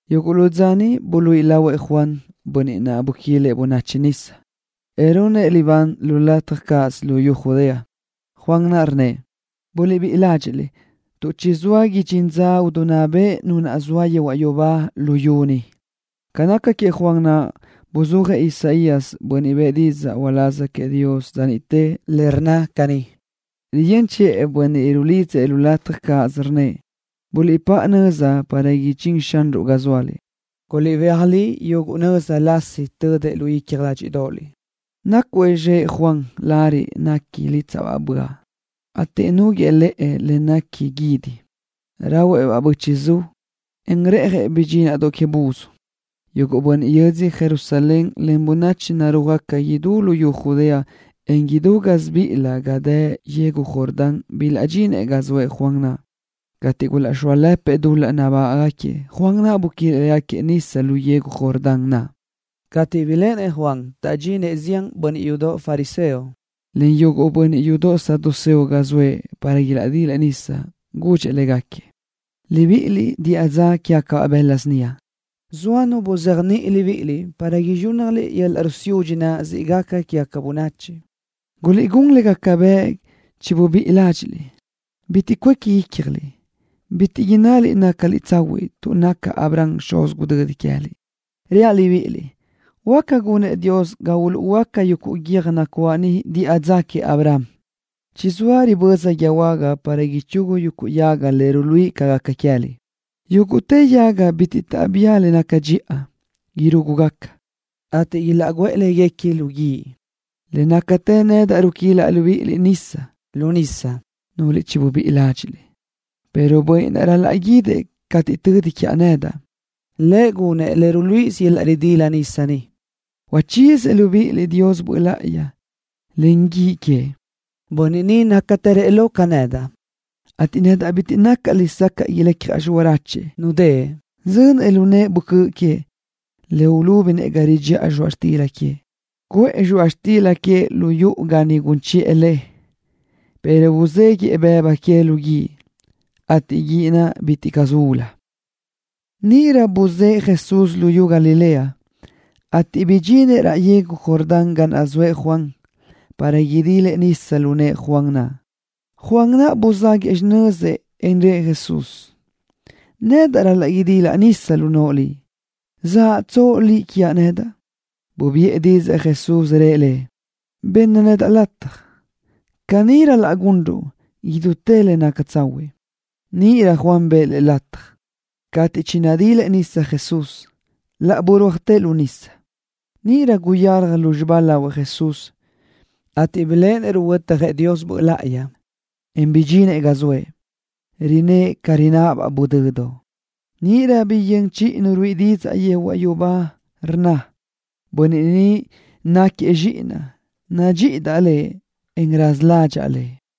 Yuguʼ lu dza niʼ buluíʼi lahuëʼ Juan, bönniʼ naʼ buquilëʼ bönachi nisa, en runëʼ libán lu lataj cáʼasö luyú Judea. Juan naʼ rnnëʼ: —Buliʼbíʼi ládxiʼliʼ, tuʼ chizóa idxín dza idinná bëʼ Nu naʼ zoa yehuaʼ yubá luyú ni. Ca naca queëʼ Juan naʼ, buzúajëʼ Isaías, bönniʼ bëʼë didzaʼ uláz queëʼ Dios dza niʼtë, le rnna caní: Riyö́n chiʼë bönniʼ rulidzëʼ lu lataj cáʼasö, rnnëʼ: “Buliʼpáʼa nöza para idxín Xanruʼ ga zóaliʼ. Guliʼbéaj li yuguʼ nöza lasi tödëʼ lu icja ládxidoʼoliʼ.” Nácuëʼ zxëʼ Juan lariʼ néquini lítsaʼbaʼ böaʼ, ateʼ núguëʼë lëʼë le néquini guídi. Rahuëʼ-baʼ bö́chiʼzu, en reʼjëʼ bidxindoʼ que buzdoʼ. Yuguʼ bönniʼ yödz Jerusalén len bönachi narúajgaca idú luyú Judea, en idú gásibiʼilö ga dë yegu Jordán bilaʼdxinëʼ ga zoëʼ Juan naʼ. Cateʼ gulaʼxóalëpëʼ dul-laʼ nabágaʼgaquiëʼ, Juan naʼ buquilëʼ légaquiëʼ nisa lu yegu Jordán naʼ. Cateʼ biléʼenëʼ Juan taʼdxinëʼ zián bönniʼ yudoʼ fariseo len yuguʼ bönniʼ yudoʼ saduceo ga zoëʼ para ilaʼdilëʼ nisa, gudxëʼ légaquiëʼ: —Libiʼiliʼ, diʼa dza quégacabaʼ bëla síniaʼ. ¿Zoa nu buzéajniʼi libíʼiliʼ para izxúnnajliʼ yöl-laʼ rusiúdxi naʼ siʼ gaca quégaca bönachi? Guliʼgún le gaca bëʼ chibubíʼi ládxiʼliʼ. Bitiʼ cuéqui ícjaliʼ, bitiʼ innaliʼ nácaliʼ tsahuiʼ tuʼ naca Abraham xuz gudödi queë́liʼ. Reaʼ libíʼiliʼ, huáca gunëʼ Dios ga uluʼhuöáca yuguʼ guiö́j nacuáʼ ni diʼa dza queëʼ Abraham. Chizóa riböza guíë huága para ichugu yuguʼ yaga le ruluíʼi ca gaca queë́liʼ. Yúguʼtë yaga bitiʼ taʼbía le naca dxiʼa, irúgugaca, ateʼ ilaʼguʼë léguequi lu guíʼ. Le nácatë nedaʼ ruquilaʼ libíʼiliʼ nisa lu nisa, núlöliʼ chibubíʼi ládxiʼliʼ, pero Bönniʼ naʼ ral-laʼ guídëʼ cateʼ tödi quiaʼ nedaʼ, Lëʼ gunëʼ le ruluíʼisö yöl-laʼ ridila nisa ni, uchíziëʼ libíʼiliʼ Dios Böʼ Láʼayi len guíʼ queëʼ. Bönniʼ ni nácatërëʼ lo ca nedaʼ, ateʼ nedaʼ bitiʼ nacaʼ lesacaʼ ilecjaʼ xiráchuëʼ nudë́ʼë. Zönëʼ lu nëʼë böcö́ʼ queëʼ, le ulúbinëʼ ga ridxiʼa zxoaʼ xtila queëʼ. Cuʼë zxoaʼ xtila queëʼ lu yuʼu ga niʼ gun chiʼë le, pero uzéguiʼë bëbu que lu guíʼ, ateʼ guíʼ naʼ bitiʼ caʼ ulu. Níʼirö buzë́ʼë Jesús luyú Galilea, ateʼ bidxinëʼ raʼ yegu Jordán ga naʼ zoëʼ Juan, para idilëʼ nisa lu nëʼë Juan naʼ. Juan buzáguëʼë xinözëʼ, en rëʼ Jesús: —Nedaʼ ral-laʼ idilaʼ nisa lu noʼo Liʼ. ¿Zaʼtsoʼ Liʼ quiaʼ nedaʼ? Bubiʼë didzaʼ Jesús, rëʼ lëʼ: —Benna lataj naʼa, tuʼ caní ral-laʼ gunruʼ idútë le naca tsahuiʼ. Níʼirö Juan bëʼë Lëʼ lataj. Cateʼ chinadilëʼ Jesús nisa, laʼ burúajtëʼ lu nisa. Níʼirö guyalaj lúzxiba lahuëʼ Jesús, ateʼ biléʼenëʼ ruhuötjëʼ Dios Böʼ Láʼayi, en bidxinëʼ ga naʼ zoëʼ, rinë́ʼë ca rináʼabaʼ guʼdödoʼ. Níʼirö biyö́n chiʼi nu ruíʼi didzaʼ yehuaʼ yubá, rnna: —Bönniʼ ni náquiëʼ Zxíʼinaʼ. Nadxíʼidaʼ Lëʼ, en raza ládxaʼa Lëʼ.